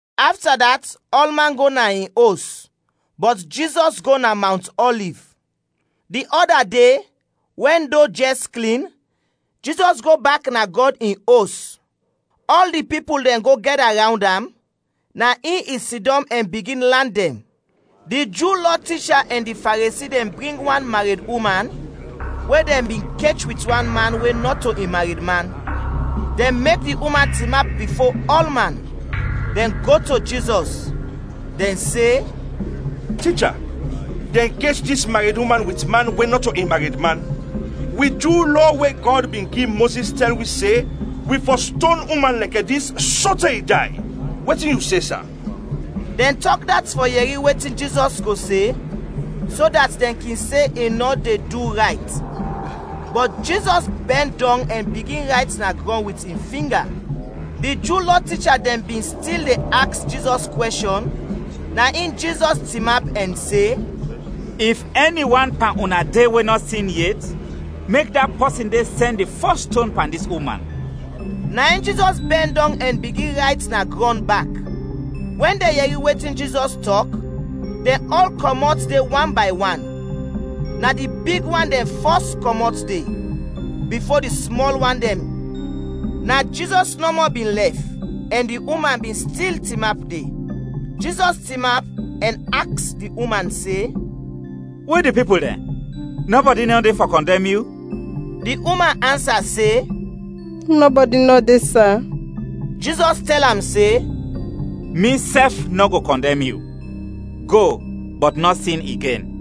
Afta dat, ɔlman go na in os, bɔt Jizɔs go na Mawnt Ɔliv. Di ɔda de, wɛn do jɛs klin, Jizɔs go bak na Gɔd in Os. Ɔl di pipul dɛn go gɛda rawnd am, na in i sidɔm ɛn bigin lan dɛn. Di Ju Lɔ ticha ɛn di Faresi dɛn bring wan mareduman we dɛn bin kech wit man we nɔto in maredman; dɛn mek di uman tinap bifo ɔlman. Dɛn go to Jizɔs. Dɛn se, “Ticha, dɛn kech dis mareduman wit man we nɔto in maredman. Wi Ju Lɔ we Gɔd bin gi Mozis tɛl wi se wi fɔ ston uman lɛkɛ dis sote i day. Wetin yu se, sa?” Dɛn tɔk dat fɔ yɛri wetin Jizɔs go se, so dat dɛn kin se i nɔ de du rayt. Bɔt Jizɔs bɛn dɔng ɛn bigin rayt na grɔn wit in finga. Di Ju Lɔ ticha dɛn bin stil de aks Jizɔs kwɛshɔn, na in Jizɔs tinap ɛn se, “If ɛni wan pan una de we nɔ sin yet, mek da pɔsin de sɛn di fɔs ston pan dis uman.” Na in Jizɔs bɛn dɔng ɛn bigin rayt na grɔn bak. Wɛn dɛn yɛri wetin Jizɔs tɔk, dɛn ɔl kɔmɔt de wan bay wan; na di big wan dɛn fɔs kɔmɔt de, bifo di smɔl wan dɛn. Na Jizɔs nɔmɔ bin lɛf ɛn di uman bin stil tinap de. Jizɔs tinap ɛn aks di uman se, “We di pipul dɛn? Nɔbɔdi nɔ de fɔ kɔndɛm yu?” Di uman ansa se, “Nɔbɔdi nɔ de, sa!” Jizɔs tɛl am se, “Misɛf nɔ go kɔndɛm yu. Go, bɔt nɔ sin igen.”]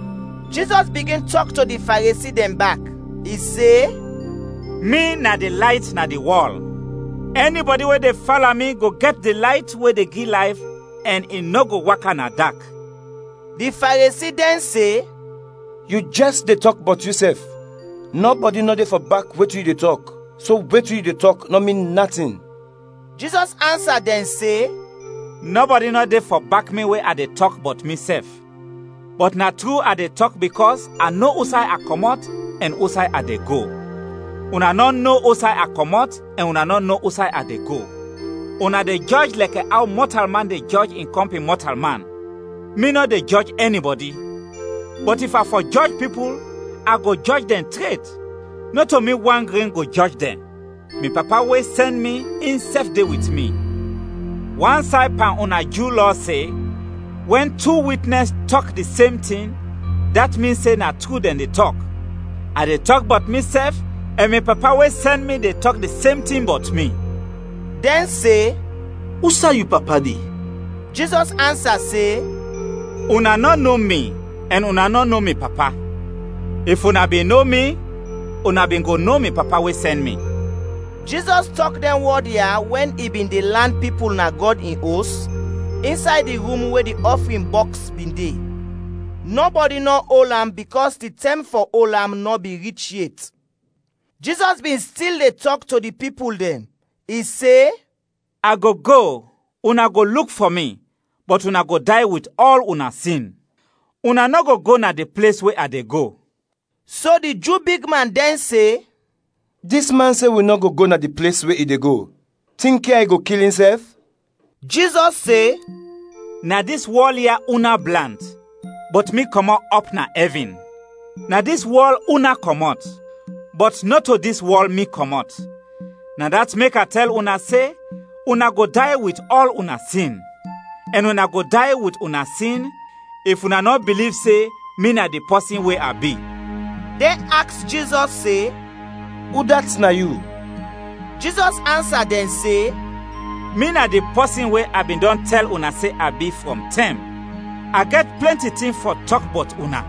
Jizɔs bigin tɔk to di Faresi dɛn bak, i se, “Mi na di Layt na di wɔl, ɛnibɔdi we de fala mi go gɛt di layt we de gi layf ɛn i nɔ go waka na dak.” Di Faresi dɛn se, “Yu jɛs de tɔk bɔt yusɛf, nɔbɔdi nɔ de fɔ bak wetin yu de tɔk, so wetin yu de tɔk nɔ min natin.” Jizɔs ansa dɛn se, “Nɔbɔdi nɔ de fɔ bak mi we a de tɔk bɔt misɛf, bɔt na tru a de tɔk bikɔs a no usay a kɔmɔt ɛn usay a de go. Una nɔ no usay a kɔmɔt ɛn una nɔ no usay a de go. Una de jɔj lɛkɛ aw mɔtalman de jɔj in kɔmpin mɔtalman, mi nɔ de jɔj ɛnibɔdi. Bɔt if a fɔ jɔj pipul, a go jɔj dɛn tret, nɔto mi wan gren go jɔj dɛn, mi Papa we sɛn mi, insɛf de wit mi. Wan say pan una Ju Lɔ se, wɛn tu witnɛs tɔk di sem tin, dat min se na tru dɛn de tɔk. A de tɔk bɔt misɛf ɛn mi Papa we sɛn mi de tɔk di sem tin bɔt mi.” Dɛn se, “Usay yu papa de?” Jizɔs ansa se, “Una nɔ no mi ɛn una nɔ no mi Papa. If una bin no mi, una bin go no mi Papa we sɛn mi.” Jizɔs tɔk dɛn wɔd ya wɛn i bin de lan pipul na Gɔd in Os, insay di rum we di ɔfrin bɔks bin de. Nɔbɔdi nɔ ol am bikɔs di tɛm we fɔ ol am nɔ bin rich yet. Jizɔs bin stil de tɔk to di pipul dɛn. I se, “A go go, una go luk fɔ mi, bɔt una go day wit ɔl una sin. Una nɔ go go na di ples we a de go.” So di Ju bigman dɛn se, “Dis man se wi nɔ go go na di ples we i de go; tinkya i go kil insɛf?” Jizɔs se, “Na dis wɔl ya una blant, bɔt mi kɔmɔt ɔp na ɛvin. Na dis wɔl una kɔmɔt, bɔt nɔto dis wɔl mi kɔmɔt. Na dat mek a tɛl una se, una go day wit ɔl una sin. Ɛn una go day wit una sin, if una nɔ biliv se ‘Mi na di pɔsin we a bi.’” Dɛn aks Jizɔs se, “Udat na yu?” Jizɔs ansa dɛn se, “Mi na di pɔsin we a bin dɔn tɛl una se a bi, frɔm tɛm. A gɛt plɛnti tin fɔ tɔk bɔt una,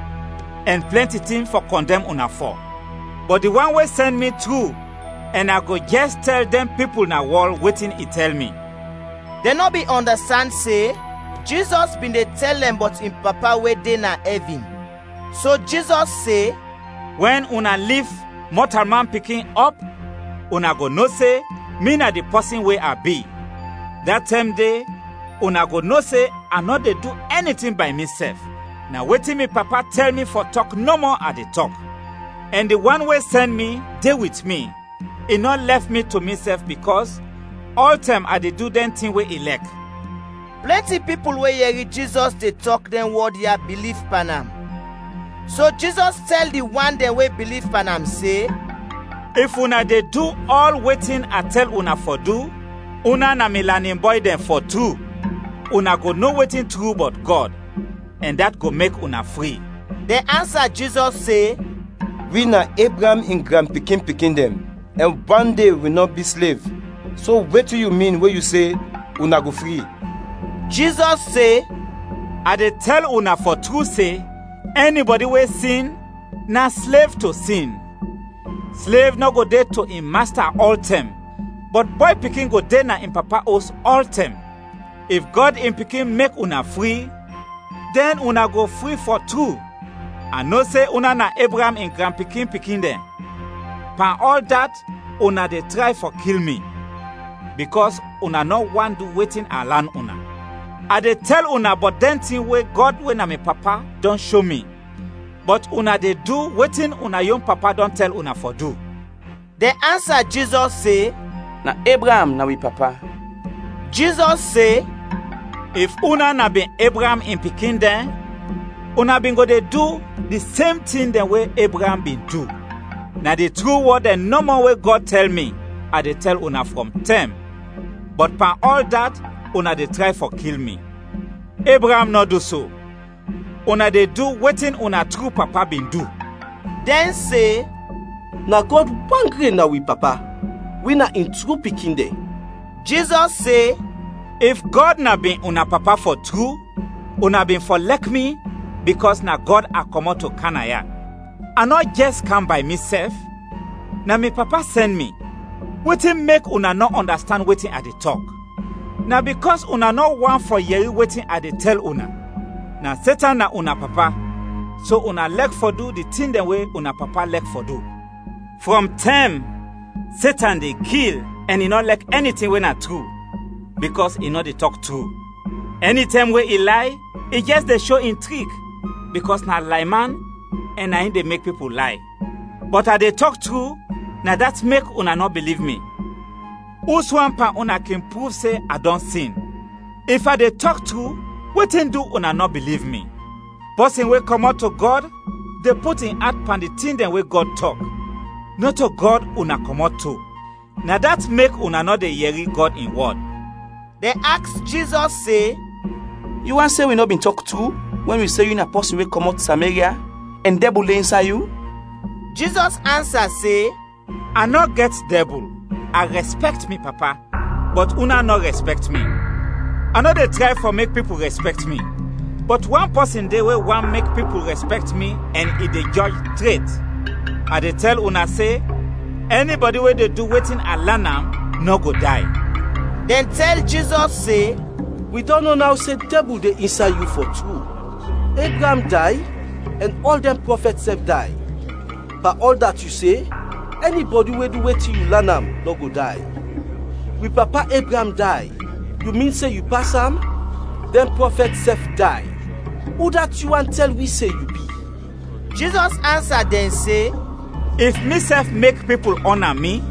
ɛn plɛnti tin fɔ kɔndɛm una fɔ. Bɔt di wan we sɛn mi, tru, ɛn a go jɛs tɛl dɛn pipul na wɔl wetin i tɛl mi.” Dɛn nɔ bin ɔndastand se Jizɔs bin de tɛl dɛn bɔt in Papa we de na ɛvin. So Jizɔs se, “Wɛn una lif Mɔtalman Pikin ɔp, una go no se, ‘Mi na di pɔsin we a bi;’ da tɛm de, una go no se a nɔ de du ɛni tin bay misɛf, na wetin mi Papa tɛl mi fɔ tɔk nɔmɔ a de tɔk. Ɛn di wan we sɛn mi de wit mi, i nɔ lɛf mi to misɛf bikɔs ɔltɛm a de du dɛn tin we i lɛk.” Plɛnti pipul we yɛri Jizɔs de tɔk dɛn wɔd ya biliv pan am. So Jizɔs tɛl di wan dɛn we biliv pan am se, “If una de du ɔl wetin a tɛl una fɔ du, una na mi lanin bɔy dɛn fɔ tru; una go no wetin tru bɔt Gɔd, ɛn dat go mek una fri.” Dɛn ansa Jizɔs se, “Wi na Ebraam in granpikin-pikin dɛn, ɛn wande wi nɔ bi slev; so, wetin yu min we yu se, ‘Una go fri?’” Jizɔs se, “A de tɛl una fɔ tru se, ɛnibɔdi we sin, na slev to sin. Slev nɔ go de to in masta ɔltɛm, bɔt bɔy pikin go de na in papa os ɔltɛm. If Gɔd in Pikin mek una fri, dɛn una go fri fɔ tru. A no se una na Ebraam in granpikin-pikin dɛn, pan ɔl dat una de tray fɔ kil mi, bikɔs una nɔ want du wetin a lan una. A de tɛl una bɔt dɛn tin we Gɔd we na mi Papa dɔn sho mi, bɔt una de du wetin una yon papa dɔn tɛl una fɔ du.” Dɛn ansa Jizɔs se, “Na Ebraam, na wi papa.” Jizɔs se, “If una na bin Ebraam in pikin dɛn, una bin go de du di sem tin dɛn we Ebraam bin du. Na di tru wɔd dɛn nɔmɔ we Gɔd tɛl mi, a de tɛl una frɔm tɛm, bɔt pan ɔl dat, una de tray fɔ kil mi. Ebraam nɔ du so. Una de du wetin una tru papa bin du.” Dɛn se, “Na Gɔd wan gren na wi papa, wi na in tru pikin dɛn.” Jizɔs se, “If Gɔd na bin una Papa fɔ tru, una bin fɔ lɛk mi, bikɔs na Gɔd a kɔmɔt to kam naya. A nɔ jɛs kam bay misɛf, na mi Papa sɛn mi. Wetin mek una nɔ ɔndastand wetin a de tɔk? Na bikɔs una nɔ want fɔ yɛri wetin a de tɛl una. Na Setan na una papa, so una lɛk fɔ du di tin dɛn we una papa lɛk fɔ du. Frɔm tɛm, Setan de kil, ɛn i nɔ lɛk ɛni tin we na tru, bikɔs i nɔ de tɔk tru. Ɛnitɛm we i lay, i jɛs de sho in trik, bikɔs na layman ɛn na in de mek pipul lay. Bɔt a de tɔk tru, na dat mek una nɔ biliv mi. Uswan pan una kin pruv se a dɔn sin? If a de tɔk tru, wetin du una nɔ biliv mi? Pɔsin we kɔmɔt to Gɔd de put in at pan di tin dɛn we Gɔd tɔk. Nɔto Gɔd una kɔmɔt to, na dat mek una nɔ de yɛri Gɔd in wɔd.” Dɛn aks Jizɔs se, “Yu want se wi nɔ bin tɔk tru wɛn wi se yu na pɔsin we kɔmɔt Sameria, ɛn dɛbul de insay yu?” Jizɔs ansa se, “A nɔ gɛt dɛbul; a rɛspɛkt mi Papa, bɔt una nɔ rɛspɛkt mi. A nɔ de tray fɔ mek pipul rɛspɛkt mi. Bɔt wan pɔsin de we want mek pipul rɛspɛkt mi ɛn i de jɔj tret. A de tɛl una se, ɛnibɔdi we de du wetin a de lan am, nɔ go day.” Dɛn tɛl Jizɔs se, “Wi dɔn no naw se dɛbul de insay yu, fɔ tru! Ebraam day, ɛn ɔl dɛn prɔfɛt sɛf day. Pan ɔl dat yu se, ɛnibɔdi we du wetin yu lan am, nɔ go day. Wi papa Ebraam day, yu min se yu pas am? Dɛn prɔfɛt sɛf day, udat yu want tɛl wi se yu bi?” Jizɔs ansa dɛn se, “If misɛf mek pipul ɔna mi,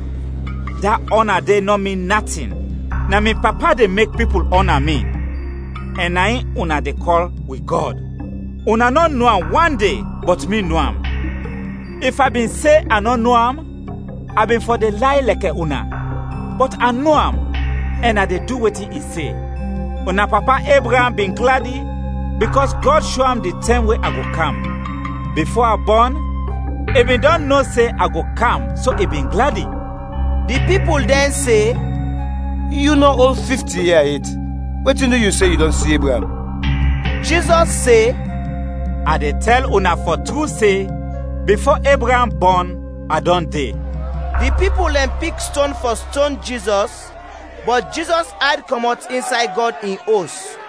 da ɔna de nɔ min natin. Na mi Papa de mek pipul ɔna mi, ɛn na in una de kɔl wi Gɔd. Una nɔ no am wande, bɔt mi no am. If a bin se a nɔ no am, a bin fɔ de lay lɛkɛ una. Bɔt a no am, ɛn a de du wetin i se. Una papa Ebraam bin gladi, bikɔs Gɔd sho am di tɛm we a go kam. Bifo a bɔn, i bin dɔn no se a go kam so i bin gladi.” Di pipul dɛn se, “Yu nɔ ol fifti ia yet, wetin du yu se yu dɔn si Ebraam?” Jizɔs se, “A de tɛl una fɔ tru se, bifo Ebraam bɔn, a dɔn de.” Di pipul dɛn pik ston fɔ ston Jizɔs, bɔt Jizɔs ayd kɔmɔt insay Gɔd in Os.